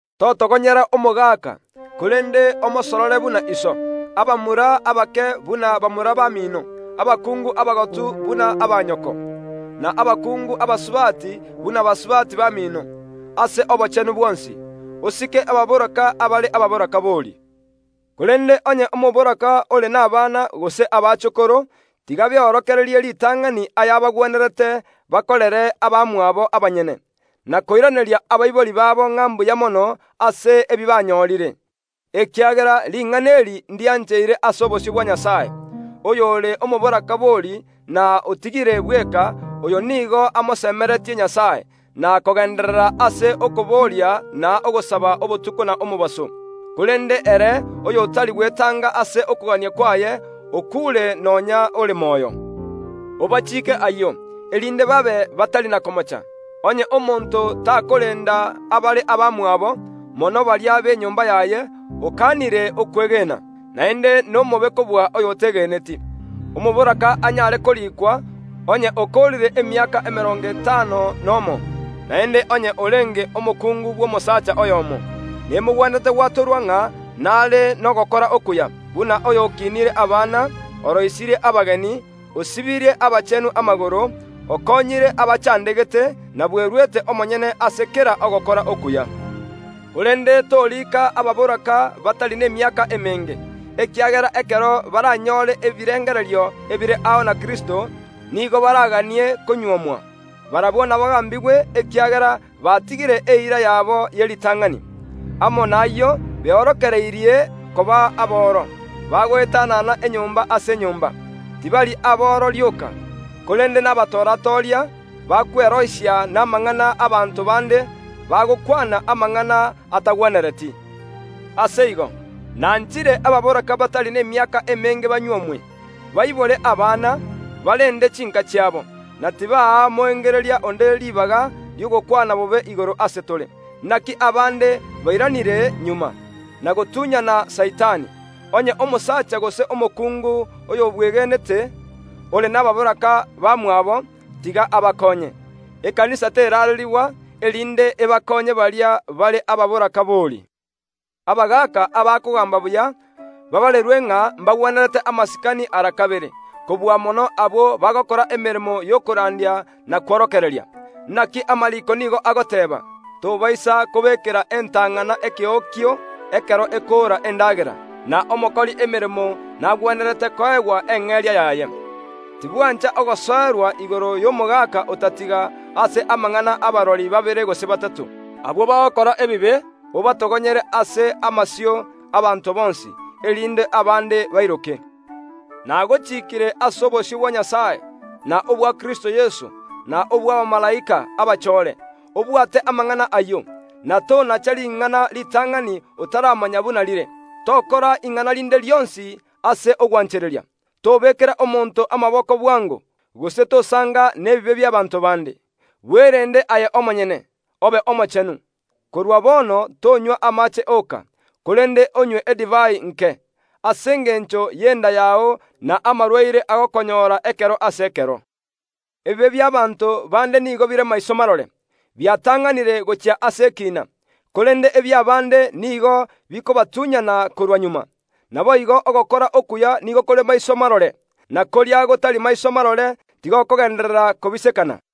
Totogonyera omogaka, korende omosorore buna iso, abamura abake buna bamura bamino, abakungu abagotu buna abaanyoko, na abakungu abasubati buna basubati bamino, ase obochenu bwonsi. Osike abatakanwa abare abataakanwa bori. Korende onye omotakaanwa ore nabana gose abaachokoro, tiga beorokererie ritang’ani ayabagwenerete bakorere abamwabo abanyene, na koiraneria abaibori babo ng’a mbuya mono ase ebi banyorire, ekiagera ring’ana eri ndiancheire ase obosio bwa Nyasae. Oyore omotaakanwa bori, na otigire bweka, oyo nigo amosemeretie Nyasae, na kogeenderera ase okoboria na ogosaba obotuko na omobaso. Korende ere, oy’otari gwetanga ase okogania kwaye, okuure nonya ore moyo. Obachiike ayio, erinde babe batari na komocha. Onye omonto takoreenda abare abamwabo, mono baria be enyomba yaye, okaanire okwegena, naende nomobe kobua oy’otegeneti. Omotakaanwa anyare koriikwa onye okoorire emiaka emerongo etano nomo, naende onye orenge omokungu bw’omosaacha oyoomo. Nemogwenerete gwatorwa ng’a nare nogokora okuya, buna oyo okinirie abana, oroisirie abageni, osibirie abachenu amagoro, okoonyire abachaandegete, na bweruete omonyene ase kera ogokora okuya. Korende toriika abatakanwa batari nemiaka emenge, ekiagera ekero baranyore ebirengererio ebire ao na Kristo, nigo baraganie konyuomwa. Barabwo nabagaambigwe, ekiagera baatigire eira yabo ye ritang’ani. Amo nayio beorokereirie koba aboro, bagoetanana enyomba ase enyomba; tibari aboro rioka, korende nabatora‐toria, bakwerosia namang’ana y’abanto bande, bagokwana amang’ana atagwenereti. Ase igo, nanchire abatakanwa batari nemiaka emenge banyuomwe, baibore abana, barende chiinka chiabo, na tibaa moengereria onde ribaga ri’ogokwana bobe igoro ase tore. Inaki abaande bairanire magega, na gotunyana Saitani. Onye omosacha gose omokungu, oyobwegenete, ore nabatakaanwa bamwabo, tiga abakoonye, ekanisa terarerigwa, erinde ebakonye baria bare abatakanwa bori. Abagaaka abakogaamba buya baabarerwe ng’a mbagwenerete amasikani ara kabere, kobua mono abwo bagokora emeremo y’okorandia na kworokereria. Inaki amariiko nigo agoteeba, “Tobaisa kobekera entang’ana ekeokio ekero ekoora endaagera”, na “Omokori emeremo nagwenerete koegwa eng’eria yaye.” Tibwancha ogosoerwa igoro y’omogaka otatiga, ase amang’ana y’abarori babere gose batato. Abwo bagokora ebibe, obatogonyere ase amasio y’abanto bonsi, erinde abaande bairoke. Nagochiikire ase obosio bwa Nyasae, na obwa Kristo Yeso, na obw’abamalaika abachoore, obwate amang’ana ayio, na tonacha ring’ana ritang’ani otaramanya buna rire; tokora ing’ana rinde rionsi ase ogwanchereria. Tobekera omonto amaboko bwango, gose tosanga nebibe bi’abaanto bande. Bwerende aye omonyene, obe omochenu. Korwa bono tonywa amaache oka, korende onywe edivai nke, ase engencho y’enda yao na amarwaire agokonyora ekero ase ekero. Ebibe bi’abaanto baande nigo bire maiso marore, biatang’anire gochia ase ekiina, korende ebi’abaande nigo bikobatunyana korwa magega. Naboigo, ogokora okuya nigo kore maiso marore, na koria gotari maiso marore tigokogenderera kobisekana.